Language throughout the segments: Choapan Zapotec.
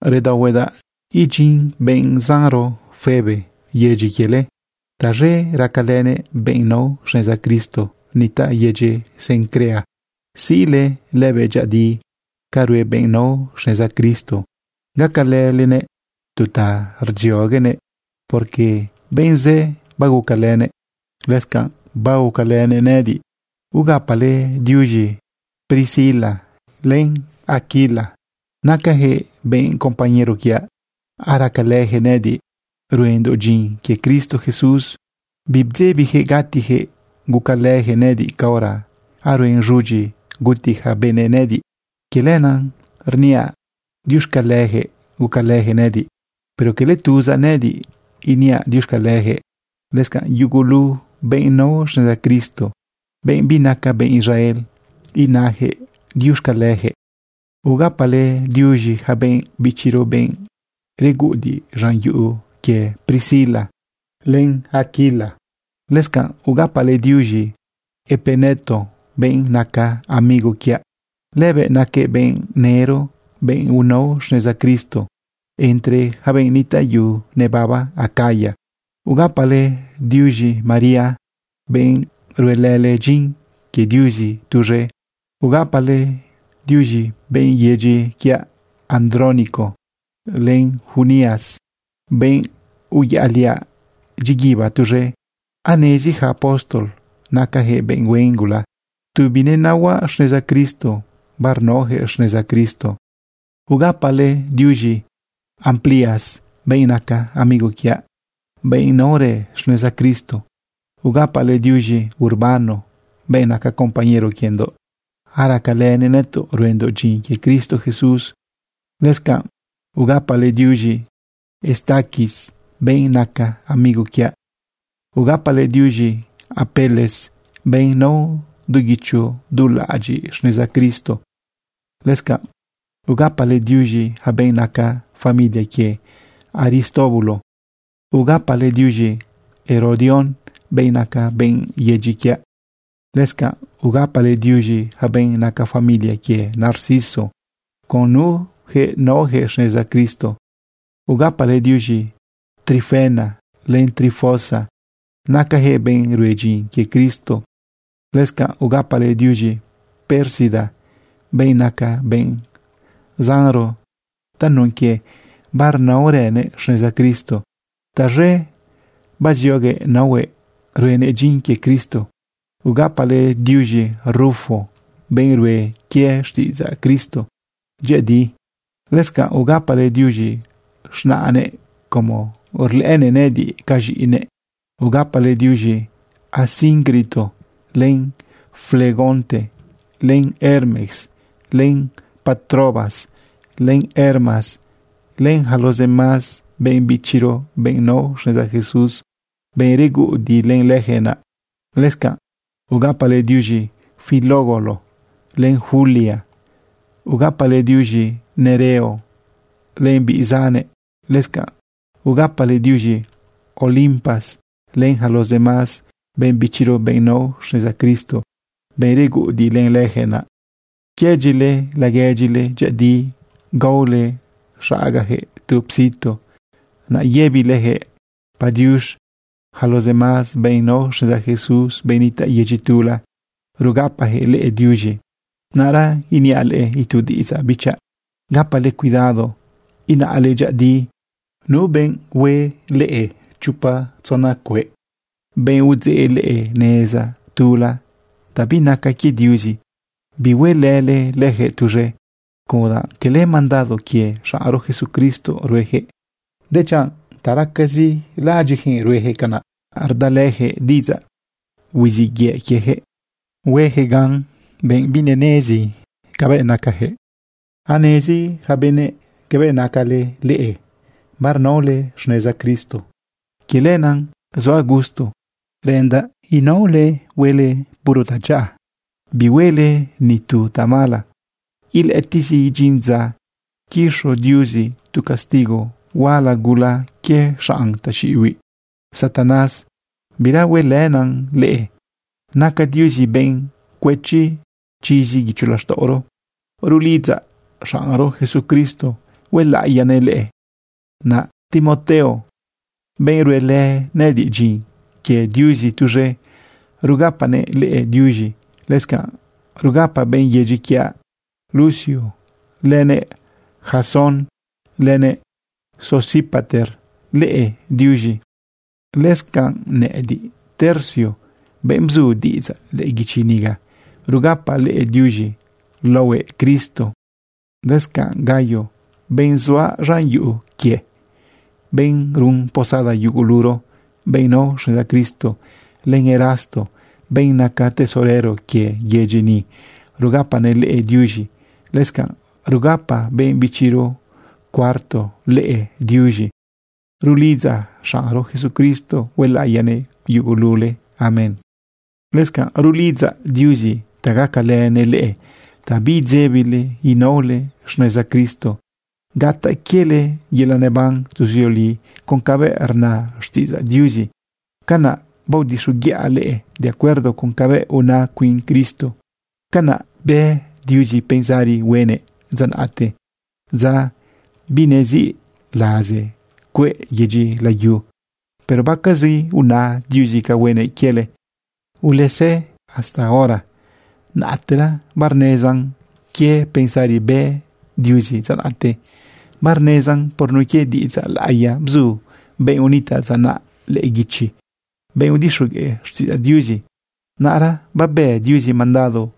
Redaohuedaꞌ idyin benꞌ zanro Febe yedyi quiele. Taz̃e racalënëꞌ benꞌ nao xneza Cristo nitaꞌ yedyi Cencrea. Siꞌle lëbëꞌ dyëꞌëdi ca rue benꞌ nao xneza Cristo. Gacalëlenëꞌ tu ta rdzioguenëꞌ, porque benꞌ zë bagucalënëꞌ. Lëscanꞌ bagucalënëꞌ nëꞌëdiꞌ. Ugapale diuz̃i Priscila len Aquilo. Nacayaquëꞌ benꞌ compañero quiaꞌ. Aracalëyaquëꞌ nëꞌëdiꞌ ruendoꞌ dyin quie Cristo Jesús. Bibdzebiyaquëꞌ gatiyaquëꞌ gucalëjëꞌ nëꞌëdiꞌ caora aruen z̃udyi guti yaca benëꞌ nëꞌëdiꞌ. Quie lenaꞌ iniaꞌ diuxcaleyaquëꞌ gucalëjëꞌ nëꞌëdiꞌ. Pero cala tuzaꞌ nëꞌëdiꞌ iniaꞌ diuxcaleyaquëꞌ, lëscanꞌ yugulu benꞌ nao xneza Cristo, benꞌ binaca benꞌ Israel, inajëꞌ diuxcaleyaquëꞌ. Ugapale diuz̃i yaca benꞌ bichiro, benꞌ reguꞌudiꞌ z̃an yuꞌu quie Priscila len Aquilo. Lëscanꞌ ugapale diuz̃i Epeneto, benꞌ naca amigo quiaꞌ. Lëbëꞌ naquëꞌ benꞌ nëro, benꞌ unao xneza Cristo entre yaca benꞌ nitaꞌ yu nebaba Acaya. Ugapale diuz̃i María, benꞌ ruelële dyin quie Diuzi tuz̃e. Ugapale diuz̃e benꞌ yedyi quiaꞌ Andrónico, len Junias, benꞌ uyaꞌliaꞌ dyiguiba tuz̃e. Anezi yaca apóstol nacayaquëꞌ benꞌ huen gula. Tu binenaohuaꞌ xneza Cristo, barnaoyaquëꞌ xneza Cristo. Ugapale diuz̃i Amplias, benꞌ naca amigo quiaꞌ, benꞌ naorë xneza Cristo. Ugapale diuz̃i Urbano, benꞌ naca compañero quiendoꞌ. Aracalënëꞌ nëtoꞌ ruendoꞌ dyin quie Cristo Jesús. Lëscanꞌ ugapale diuz̃i Estaquis, benꞌ naca amigo quiaꞌ. Ugapale diuz̃i Apeles, benꞌ nao du guicho du laꞌadyiꞌ xneza Cristo. Lëscanꞌ ugapale diuz̃i yaca benꞌ naca familia quie Aristóbulo. Ugapale diuz̃i Herodión, benꞌ naca benꞌ yedyi quiaꞌ. Lëscanꞌ ugapale diuz̃i yaca benꞌ naca familia quie Narciso, con nuyaquëꞌ naoyaquëꞌ xneza Cristo. Ugapale diuz̃i Trifena len Trifosa. Nacajëꞌ benꞌ rue dyin quie Cristo. Lëscanꞌ ugapale diuz̃i Pérsida, benꞌ naca benꞌ zanro tanun quie barnaorënëꞌ xneza Cristo. Taz̃e bazioguëꞌ naohuëꞌ ruenëꞌ dyin quie Cristo. Ugapale diuz̃i Rufo, benꞌ rue quie xtiꞌidzaꞌ Cristo dyëꞌëdi. Lëscanꞌ ugapale diuz̃i z̃naꞌnëꞌ como rlëꞌënëꞌ nëꞌëdiꞌ ca z̃iꞌinëꞌ. Ugapale diuz̃i Asíncrito, len Flegonte, len Hermes, len Patrobas, len Hermas, len yaca los demás benꞌ bichiro, benꞌ nao xneza Jesús, benꞌ reguꞌudiꞌ len leyaquëꞌ naꞌ. Lëscanꞌ ugapale diuz̃i Filólogo len Julia. Ugapale diuz̃i Nereo len biꞌ zannëꞌ. Lëscanꞌ ugapale diuz̃i Olimpas len yaca los demás benꞌ bichiro, benꞌ nao xneza Cristo, benꞌ reguꞌudiꞌ len leyaquëꞌ naꞌ. Quëdyile laguedyile dyëꞌëdi. Gaole xagajëꞌ tu psitu, naꞌ yëbileyaquëꞌ padiux. Yaca los demás benꞌ nao xneza Jesús, benꞌ nitaꞌ yedyi tula, rugapajëꞌ leꞌe diuz̃i. Naꞌra iniaꞌ leꞌe itu diꞌidzaꞌ, bichaꞌ. Gapale cuidado inaꞌle dyëꞌëdi nu benꞌ hue leꞌe chopa tzona cueꞌ, benꞌ udzeꞌ leꞌe neza tula ta binaca quie Diuzi. Bihuelële leyaquëꞌ tuz̃e, como danꞌ cala mandado quie xaꞌnro Jesucristo ruejëꞌ, dechanꞌ ta racazi laꞌadyiꞌjëꞌ ruejëꞌ canaꞌ. Rdalëyaquëꞌ diꞌidzaꞌ huiziꞌ yëꞌ quieyaquëꞌ huejëꞌ gan benꞌ binenezi cabëꞌ nacayaquëꞌ. Anezi yaca benëꞌ cabëꞌ naca leꞌe, barnaole xneza Cristo. Quie lenaꞌ zuaꞌ gusto, reꞌendaꞌ huele seguir huele puro tadyaꞌa, bihuele ni tu tamala. Ilëꞌëtiꞌzi idyin dza quiz̃o Diuzi tu castigo huala gula quie xanꞌ taxiꞌibiꞌ Satanás. Bira huelënan leꞌe. Naca Diuzi benꞌ cuëchi chizi guicho laxtaꞌoro. Rulidzaꞌ xaꞌnro Jesucristo huelaꞌiyanëꞌ leꞌe. Naꞌ Timoteo, benꞌ ruelë nëꞌëdiꞌ dyin quie Diuzi tuz̃e, rugapanëꞌ leꞌe diuz̃i. Lëscanꞌ rugapa benꞌ yedyi quiaꞌ Lucio, lënëꞌ Jasón, lënëꞌ Sosipater leꞌe diuz̃i. Lëscanꞌ nëꞌëdiꞌ, Tercio, benꞌ bzu diꞌidzaꞌ lëꞌë guichi niga, rugapaꞌ leꞌe diuz̃i laohue Cristo. Lëscanꞌ Gayo, benꞌ zuaꞌ z̃an yuꞌu quie, benꞌ run posada yuguluro benꞌ nao xneza Cristo, len Erasto, benꞌ naca tesorero quie yedyi ni, rugapanëꞌ leꞌe diuz̃i. Lëscanꞌ rugapa benꞌ bichiro Cuarto leꞌe diuz̃i. Rulidzaꞌ xaꞌnro Jesucristo huelaꞌiyanëꞌ yugulule. Amén. Lëscanꞌ rulidzaꞌ Diuzi ta gacalënëꞌ leꞌe ta biidzebile inaole xneza Cristo gataꞌ quiele yelaꞌ neban tuzioli con cabëꞌ rna xtiꞌidzaꞌ Diuzi. Canaꞌ baodixoguiꞌa leꞌe de acuerdo con cabëꞌ una cuin Cristo. Canaꞌ bë Diuzi pensari huenëꞌ dza naꞌte, dza binesiꞌ laze cueꞌ yedyi layu. Pero baquezi biuna Diuzi ca huenëꞌ quiele. Ulezëꞌ hasta hora, naꞌtera barnezan quie pensari bë Diuzi dza naꞌte. Barnezan por nun quie diꞌidzaꞌ laꞌiya bzu benꞌ unitaꞌ dza naꞌ lëꞌë guichi, benꞌ udixogueꞌ xtiꞌidzaꞌ Diuzi. Naꞌra babë Diuzi mandado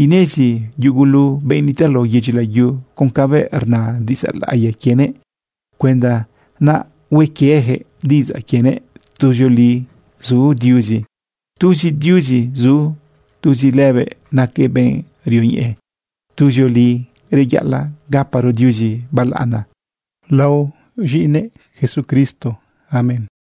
inezi yugulu benꞌ nitaꞌ lao yedyi layu con cabëꞌ rna diꞌidzaꞌ laꞌiya quienëꞌ cuenda naꞌ hue quieyaquëꞌ diꞌidzaꞌ quienëꞌ. Tuzioli zu Diuzi. Tuzi Diuzi zu. Tuzi lëbëꞌ naquëꞌ benꞌ rioñeꞌe. Tuzioli reyaꞌalaꞌ gaparo Diuzi balaꞌana laohue z̃iꞌinëꞌ Jesucristo. Amén.